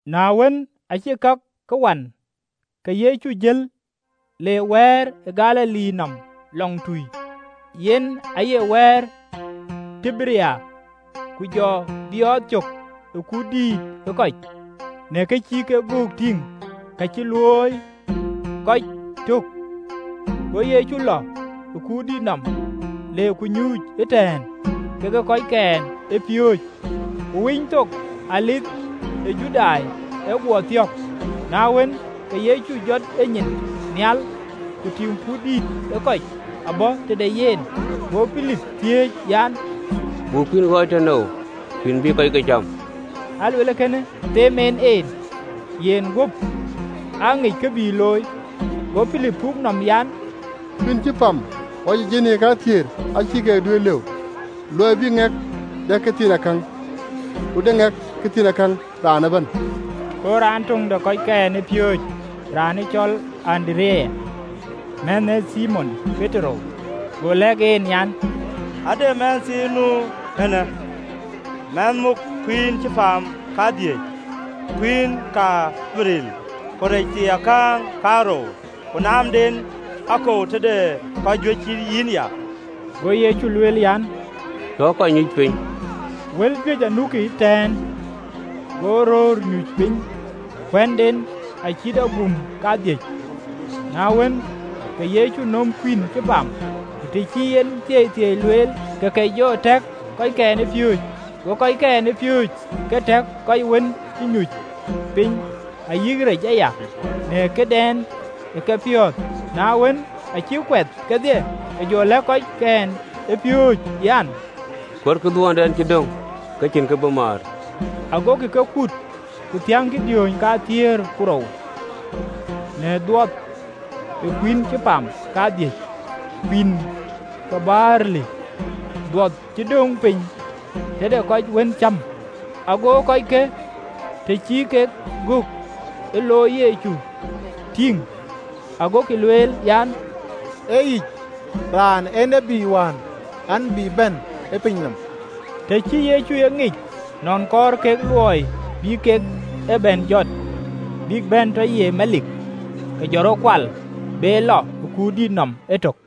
Na wën, acï kakë wan, ke Yecu jël le Baar ë Galili nɔm lɔŋtui, (yen aye wɛ̈ɛ̈r ë Tiberia). Ku jɔ biɔɔth cök ë kut dïït ë kɔc, në kë cï kek göök tïŋ ka cï luöi kɔc tök. Go Yecu lɔ ë kuurdït nɔm, le ku nyuuc ëtɛ̈ɛ̈n kekë kɔckɛn ë piööcë. Ku Winythok, Dhuëëŋ ë Judai, ë guɔ thiɔ̈k. Na wën, ke Yecu jɔt enyin nhial, ku tïŋ kut dïït ë kɔc abɔ̈ tëde yen, go Pilip thiëëc an, “Buk kuïn ɣɔɔc tënou, kuïn bïï kɔckë cam?” (Aa lueel kënë them en en: yen guöp aŋic kë bï looi.) Go Pilip puk nɔm an, “Kuïn cï pam ɣɔc ë jinii kathiëër acïï keek duëër lëu, luɔi bï ŋɛk dɛ këthiinakäŋ, ku de ŋɛk këthiinakäŋ, raan ëbɛ̈n.” Go raan töŋ de kɔckɛn ë piööcë raan cɔl Andereya, mänhë ë Thimon Petero, go lɛ̈k en, an, “Ade mɛnhthiin nu eenë, mɛnh muk kuïïn cï pam kadhïc kuïïn ke barli, ku rec thiiakäŋ kaarou: ku naamden akou tëde kɔc juëc yïnya?” Go Yecu lueel an, “Tɔ kɔc nyuc piny.” Wal juëc anukï ëtɛ̈ɛ̈n. Go röör nyuc piny, kuënden acït aguum kadhïc. Na wën, ke Yecu nöm kuïïn cï pam, ku të cï en thieithieei lueel, ke ke jɔ tɛ̈k kɔckɛn ë piööcë ku tɛ̈kkï kɔc wën cï nyuc piny. Ayï rec aya acï keek looi aya, agokï yök ëbɛ̈n në këdɛn ë kekpiɔ̈ɔ̈th. Na wën, acïk kuɛth kedhie, ke jɔ lɛ̈k kɔckɛn ë piööcë an, “Kuötkï dhuɔtdɛn cï döŋ ke cïn kë bï määr.” Agokï ke kut, ku thiäŋkï diööny kathiëër ku rou në dhuɔth ë kuïïn cï pam kadhïc, kuïïn ke barli, dhuɔth cï döŋ piny tëde kɔc wën cäm. Ago kɔckë, të cï kek gök cï Yecu looi tïŋ, agokï lueel an, “Ee yic, raanë ee tiët wään, an, bï bɛ̈n ë piny nɔm!” Të cï Yecu e ŋic nɔn kɔɔr kek luɔi bï kek ë bɛ̈n jɔt, bïk bɛ̈n tɔ ye melik, ke jɔ rɔt kual be lɔ ë kuurdït nɔm etök.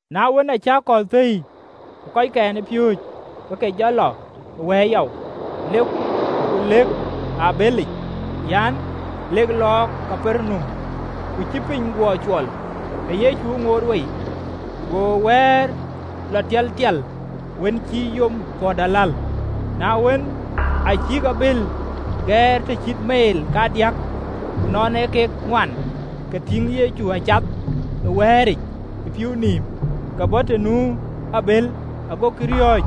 Na wën, aacï akɔ̈l thëi, ke kɔckɛn ë piööcë ke ke jɔ lɔ ë wɛ̈ɛ̈r yɔu, ku lekï ë abëlic, alek lɔɔk Kapernaum. Ku cï piny guɔ cuɔl, ke Yecu ŋoot wei. Go wɛ̈ɛ̈r lɔ tialtial, wën cï yom pɔ̈t aläl. Na wën, acïk abël gɛɛr të cït meel kadiäk, ku nɔn ee kek ŋuan, ke ke tïŋ Yecu acath ë wɛ̈ɛ̈ric ë pïïu nïïm, ke bɔ̈ të nu abël: agokï riɔ̈ɔ̈c.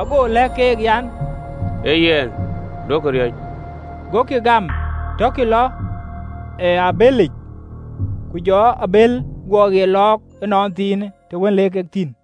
Ago lɛ̈k keek an, “Ee yɛn, duökï riɔ̈c.” Gokï gam tɔkï lɔ ë abëlic: ku jɔ abël guɔ ɣet lɔɔk ënɔnthiinë, të wën le kek thïn.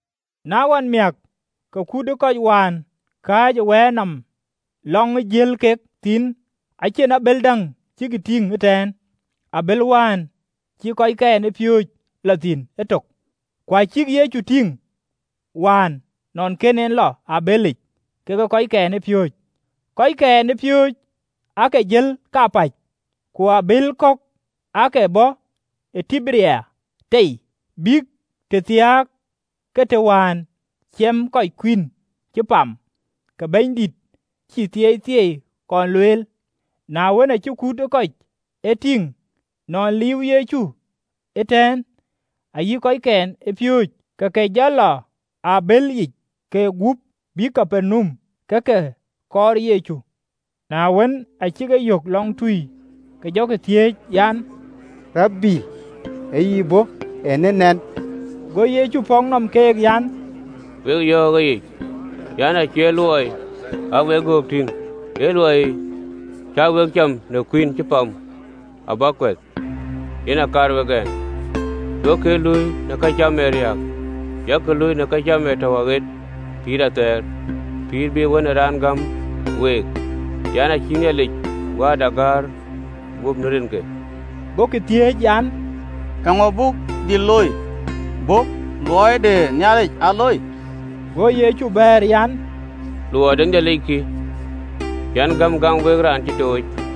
Na ɣɔn amiäk, ke kut ë kɔc wään kääc ë wɛ̈ɛ̈r nɔm, lɔŋ ë jël kek thïn, acïn abël däŋ ë cïk tïŋ ëtɛ̈ɛ̈n, ee abël wään cï kɔckɛn ë piööcë lɔ thïn etök, ku acïk Yecu tïŋ wään nɔn kën en lɔ ë abëlic kekë kɔckɛn ë piööcë, kɔckɛn ë piööcë aake jël kapäc. (Ku abëël kɔ̈k aake bɔ̈ ë Tiberia tei, bïk tëthiääk ke të wään ciɛmë kɔc kuïn cï pam, ke Bɛ̈nydït cï thieithieei kɔn lueel): Na wën, acï kut ë kɔc e tïŋ nɔn liiuwë Yecu ëtɛ̈ɛ̈n, ayï kɔckɛn ë piööcë, ke ke jɔ lɔ ë abëël yiic kek gup, bïk Kapernaum, ke ke kɔɔr Yecu. Na wën, acïk e yök lɔŋtui, ke jɔkï thiëëc an, “Rabi, ë yï bɔ̈ eenë nɛn?” Go Yecu pɔ̈k nɔm keek an, “Wek yɔ̈ɔ̈k ëyic, an, acie luɔi cä wek göök tïŋ, ee luɔi cä wek cam në kuïn cï pam, abäk kuɛth, yen aa kaar wek ɛn. Duökï ee luui në këcam ee riääk, yak luui në këcam ee tɔ̈u aɣet pïïr athɛɛr, pïïr bïï Wën ë Raan gäm week: yen acïï Nhialic Wääda gäär guöp rinke.” Gokï thiëëc an, “Eeŋö buk dhil looi, ke wo bï luɔi de Nhialic aa looi?” Go Yecu bɛ̈ɛ̈r an, “Luɔi de Nhialic kï an, gëm gam wek raan cï tooc.”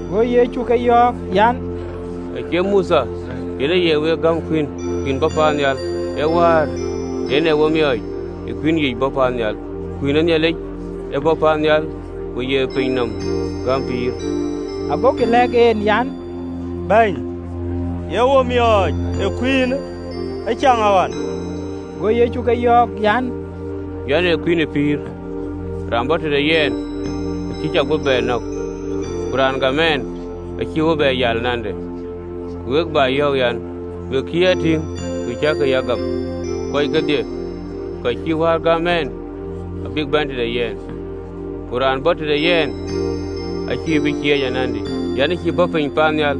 Go Yecu ke yɔ̈ɔ̈k an, “Acie Mothe yen ë ye week gäm kuïnë, kuïn bɔ̈ paannhial, ee Wäär yen ee we miɔɔc ë kuïn yic bɔ̈ paannhial. Kuïn ë Nhialic ee kë bɔ̈ piny paannhial, ku ye piny nɔm gäm pïïr.” Agokï lɛ̈k en an, “Bɛ̈ny, ye wo miɔɔc ë kuïnë ëcaŋɣɔn.” Go Yecu ke yɔ̈ɔ̈k an, “Yɛn ee kuïn ë pïïr: raan bɔ̈ tëde yɛn, acïn cɔŋ bï ye bɛ nɔ̈k, ku raan gam ɛn, acïï bï bɛ yal anande. Ku we cä yɔ̈ɔ̈k an, we cï a tïŋ, ku cäkï ya gam. Kɔc kedhie kɔc cï Wäär gäm ɛn, abïk bɛ̈n tëde yɛn, ku raan bɔ̈ tëde yɛn acä bï cieec anandï. Yɛn ëcïï bɔ̈ piny paannhial,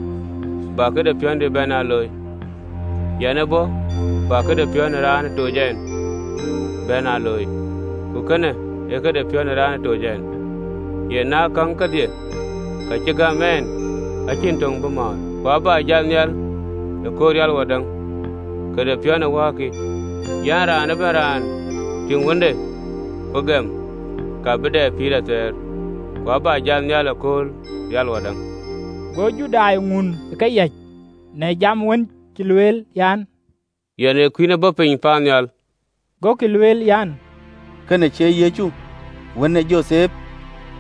bä këde piɔ̈ndï bɛ̈n aa looi, yɛn ë bɔ̈ bä këde piɔ̈n ë raan ë toc ɛn bɛ̈n aa looi. Ku kënë ee këde piɔ̈n ë raan ë toc ɛn an, në käŋ kedhie ka cï gäm ɛn, acïn töŋ bä mɔ̈ɔ̈r, ku abä bɛ jat nhial ëkööl rial wadäŋ. Këde piɔ̈n ë Wäär kï, an, bï raan ëbɛ̈n raan tïŋ Wënde, ku gɛm, ka bï bɛ pïïr athɛɛr, ku abä jat nhial ëkööl rial wadäŋ.” Go Judai ŋun ë keyäc, në jam wën cï lueel, an, “Yɛn ee kuïn ë bɔ̈ piny paannhial.” Gokï lueel an, “Kënë cie Yecu, wën ë Jothep,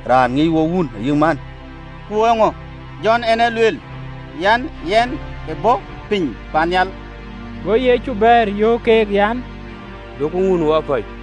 raan ŋic wok wun ayï man? Ku eeŋö jɔ en ë lueel an, yɛn ë bɔ̈ piny paannhial?” Go Yecu bɛ̈ɛ̈r, yöök keek an, “Duökï ŋun wapäc.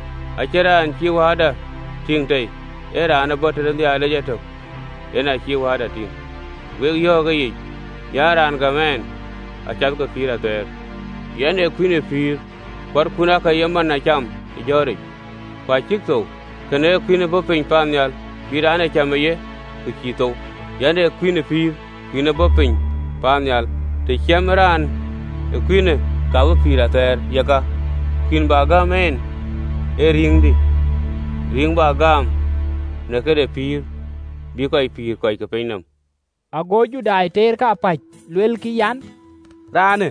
Acïn raan cï Wääda tïŋ tei, ee raan bɔ̈ tëde Nhialic etök, yen acï Wääda tïŋ. Wek yɔ̈ɔ̈k ëyic: an raan gam ɛn acath ke pïïr athɛɛr. Yɛn ee kuïn ë pïïr. Kuarkun aake ye mana cam ë jɔ̈ɔ̈ric, ku acïk thou. Kënë ee kuïn bɔ̈ piny paannhial, bï raan aa cam ë ye, ke cïï thou. Yɛn ee kuïn ë pïïr kuïn ë bɔ̈ piny paannhial: të ciɛmë raan ee kuïnë, ka bï pïïr athɛɛr: yeka, kuïn bä gam en ee rïïŋdï, rïïŋ bä gaam në këde pïïr bï kɔc pïïr kɔc ke piny nɔm.” Ago Judai teer kapäc, luelkï an, “Raan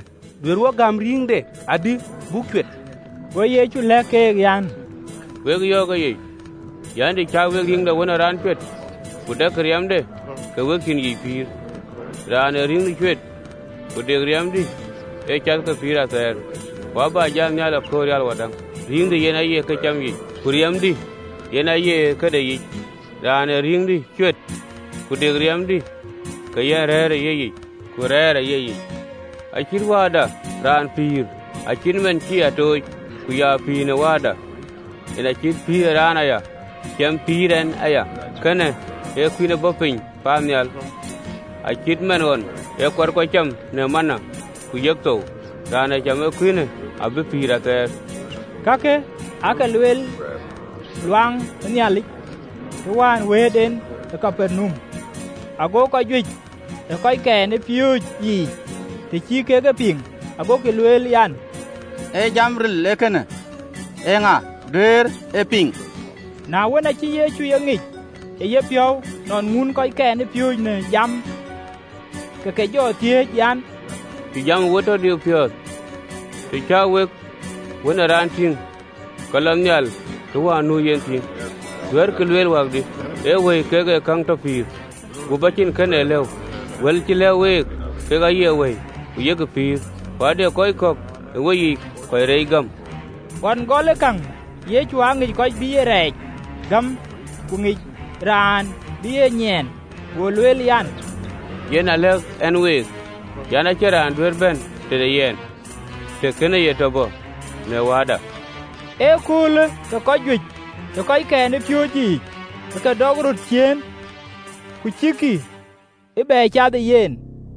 duëër wo gäm rïïŋde adï buk cuet?” Go Yecu lɛ̈k keek an, “Wek yɔ̈ɔ̈k ëyic an, të cä wek rïïŋ ë Wën ë Raan ee cuet, ku dɛkkï riɛmde, ka we cïn yiic pïïr. Raan ee rïïŋdï cuet, ku dek riɛmdï, ee cath ke pïïr athɛɛr, ku abä jat nhial ëkööl rial wadäŋ. Rïïŋdï yen aye këcam yic, ku riɛmdï yen aye këdek yic. Raan ee rïïŋdï cuet, ku dek riɛmdï, ka ye rëër ë yayic, ku rɛ̈ɛ̈r ë yeyic. Acït Wääda, Raan pïïr, acït man cï en a tooc, ku ya pïïr në Wääda, yen acït pïïr ee raan ë ya cam pïïr ë yen aya. Kënë ee kuïn ë bɔ̈ piny paannhial: acïï cït man ɣɔn ye kuarkun cam në mana, ku yek thou, raan ë cam ë kuïnë abï pïïr athɛɛr.” Kakë aake lueel ɣön ë Nhialic, të wään wëët en ë Kapernaum. Ago kɔc juëc ë kɔckɛn ë piööcë yiic, të cï kek e piŋ, agokï lueel an, “Ee jam ril ee kënë, eeŋa duëër e piŋ?” Na wën, acï Yecu ë ŋic ë yepiɔ̈u nɔn ŋuunë kɔckɛn ë piööcë në jamë, ke ke jɔ thiëëc an, “Cï jamë we tɔ diu piɔ̈ɔ̈th?” Të cä wek Wën ë Raan tïŋ ke lɔ nhial të wään nu yen thïn, duɛ̈ɛ̈rkï lueel wäkdï? Ee wëi kek ee käŋ tɔ pïïr, guöp acïn kën ee lëu: wël cä lɛ̈k week, kek aye wëi, ku yek pïïr. Ku ade kɔc kɔ̈k ë weyiic kɔc reec gäm.” (Ɣɔn gɔlë käŋ Yecu aa ŋic kɔc bï ye rɛɛc gam, ku ŋic raan bï ye nyiɛɛn.) Go lueel an, “Yen aa lɛ̈k ɛn week an, Acïn raan duëër bɛ̈n tëde yɛn, të kënë ye tɔ bɔ̈ në Wääda.” Ëköölë ke kɔc juëc ë kɔckɛn ë piööcë yiic ke ke dɔk röt ciëën, ku cïkï ë bɛ cath ëyen.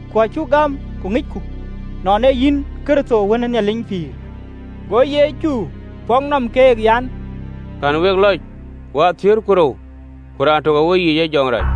Ku acuk gam ku ŋicku nɔn ee yïn Kërtho ɣeric Wën ë Nhialic.” Go Yecu pɔ̈k nɔm keek an, “Kɛ̈n week lɔc wathiëër ku rou, ku raan tök ë weyiic ee jɔŋdït rac!”